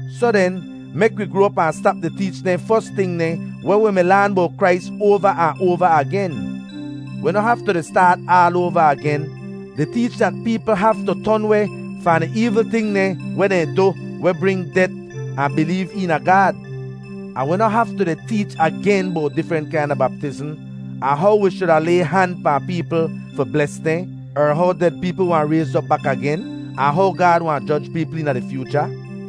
Soh den, mek wi groa op ahn stap di teech dehn fos ting dehn weh wi mi laan bowt Krais oava ahn oava agen. Wi noh haftu di staat aal oava agen di teech dat peepl haftu ton weh fahn di eevl ting dehn weh dehn du weh bring det, ahn bileev eena Gaad. Ahn wi noh haftu di teech agen bowt difrent kaina baptizm, ahn how wi shuda lay han pahn peepl fi bles dehn, er how ded peepl wahn rayz op bak agen, ahn how Gaad wahn joj peepl eena di fyoocha.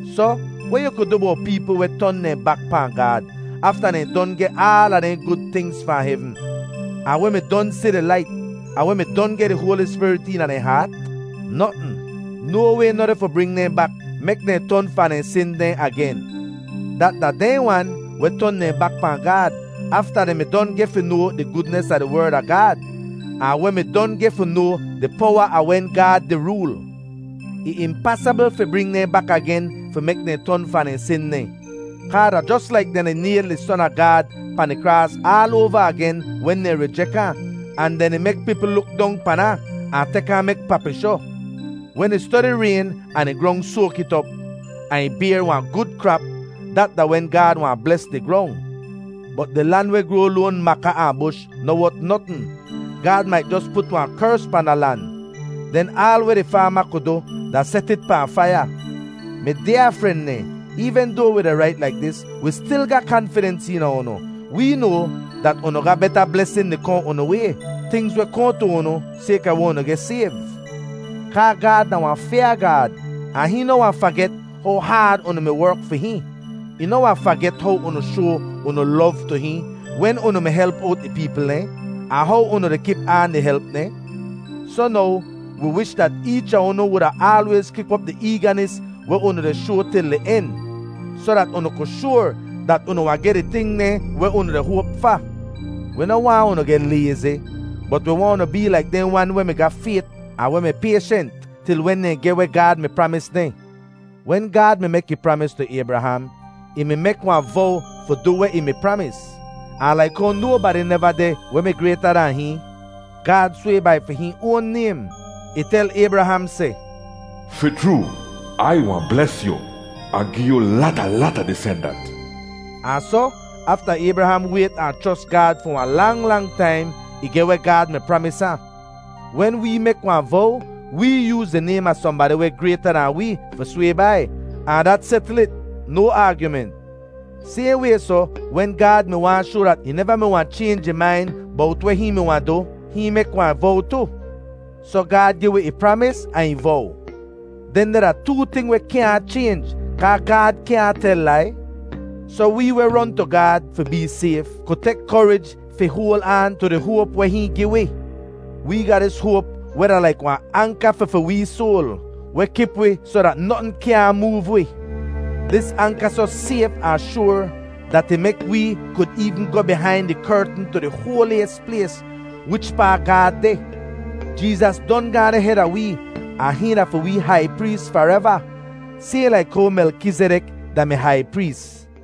Soh, weh yu ku du bowt peepl weh ton dehn bak pahn Gaad afta dehn don geh aala dehn gud tingz fahn hevn, ahn weh mi don si di lait, ahn weh mi don geh di Hoali Spirit eena dehn haat? Notn. No way noh deh fi bring dehn bak mek dehn ton fahn dehn sin dehn agen. Dat da dehn wan weh ton dehn bak pahn Gaad afta dehn mi don geh fi noa di gudnis a di Werd a Gaad, ahn weh mi don geh fi noa di powa a wen Gaad di rool. Ih impasabl fi bring dehn bak agen fi mek dehn ton fahn dehn sin dehn, kaa da jos laik dehn di nayl di Son a Gaad pahn di kraas aal oava agen wen dehn rijek ahn, ahn dehn di mek peepl luk dong pan ahn, ahn tek ahn mek papishoh. Wen ih stodi rayn ahn di grong soak it op, ahn ih bayr wahn gud krap, dat da wen Gaad wahn bles di grong. Bot di lan weh groa loan maka ahn bush noh wot notn. Gaad mait jos put wahn kers pahn da lan. Den aal weh di faama ku du da set it pahn faiya. Mi dyaa fren dehn, eevn doa wi di rait laik dis, wi stil ga kanfidens eena unu. Wee noa dat unu ga beta blesin di kohn unu way, tingz weh kohn tu unu sayka weh unu geh sayv. Kaa Gaad da wahn fyaa Gaad, ahn hihn noh wahn faget how haad unu mi werk fi hihn. Ih noh wahn faget how unu shoa unu lov tu hihn wen unu mi help owt ih peepl dehn, ahn how unu di kip aan di help dehn. Soh now, wi wish dat eech a unu wuda aalwayz kip op di eeganis weh unu di shoa til di en, soh dat unu ku shoar dat unu wahn geh di ting dehn weh unu di hoap fa. Wi noh waahn unu geh layzi, bot wi waahn unu bee laik dehn wan weh mi ga fayt ahn weh mi payshent til wen dehn geh weh Gaad mi pramis dehn. Wen Gaad mi mek ih pramis tu Aybraham, ih mi mek wahn vow fi du weh ih mi pramis, ahn laik how nobadi neva deh weh mi grayta dan hihn, Gaad sway bai fi hihn oan naym. Ih tel Aybraham seh, “Fi chroo, Ai wahn bles yu ahn gi yu lata, lata disendant.” Ahn soh, afta Aybraham wayt ahn chros Gaad fi wahn lang, lang taim, ih geh weh Gaad mi pramis ahn. Wen wee mek wahn vow, wee yooz di naym a sohnbadi weh grayta dahn wee fi sway bai, ahn dat setl it, no aagyument. Sayhn way soh, wen Gaad mi waahn shoa dat ih neva mi wahn chaynj ih main bowt weh hihn mi wahn du, hihn mek wahn vow tu. Soh Gaad gi wi ih pramis ahn ih vow. Dehndeh da too ting weh kyaahn chaynj kaa Gaad kyaahn tel lai. Soh wee weh ron tu Gaad fi bee sayf ku tek korij fi hoal aan tu di hoap weh hihn gi wi. Wee ga dis hoap weh da laik wahn anka fi fi wee soal, weh kip wi soh dat notn kyaahn moov wi. Dis anka soh sayf ahn shoar, dat ih mek wee kud eevn goh bihain di kertn tu di hoaliyis plays wichpaa Gaad deh! Jeezas don gaahn deh heda wee, ahn hihn da fi wee hai prees fareva, sayhn laik how Melkizidek da-mi hai prees.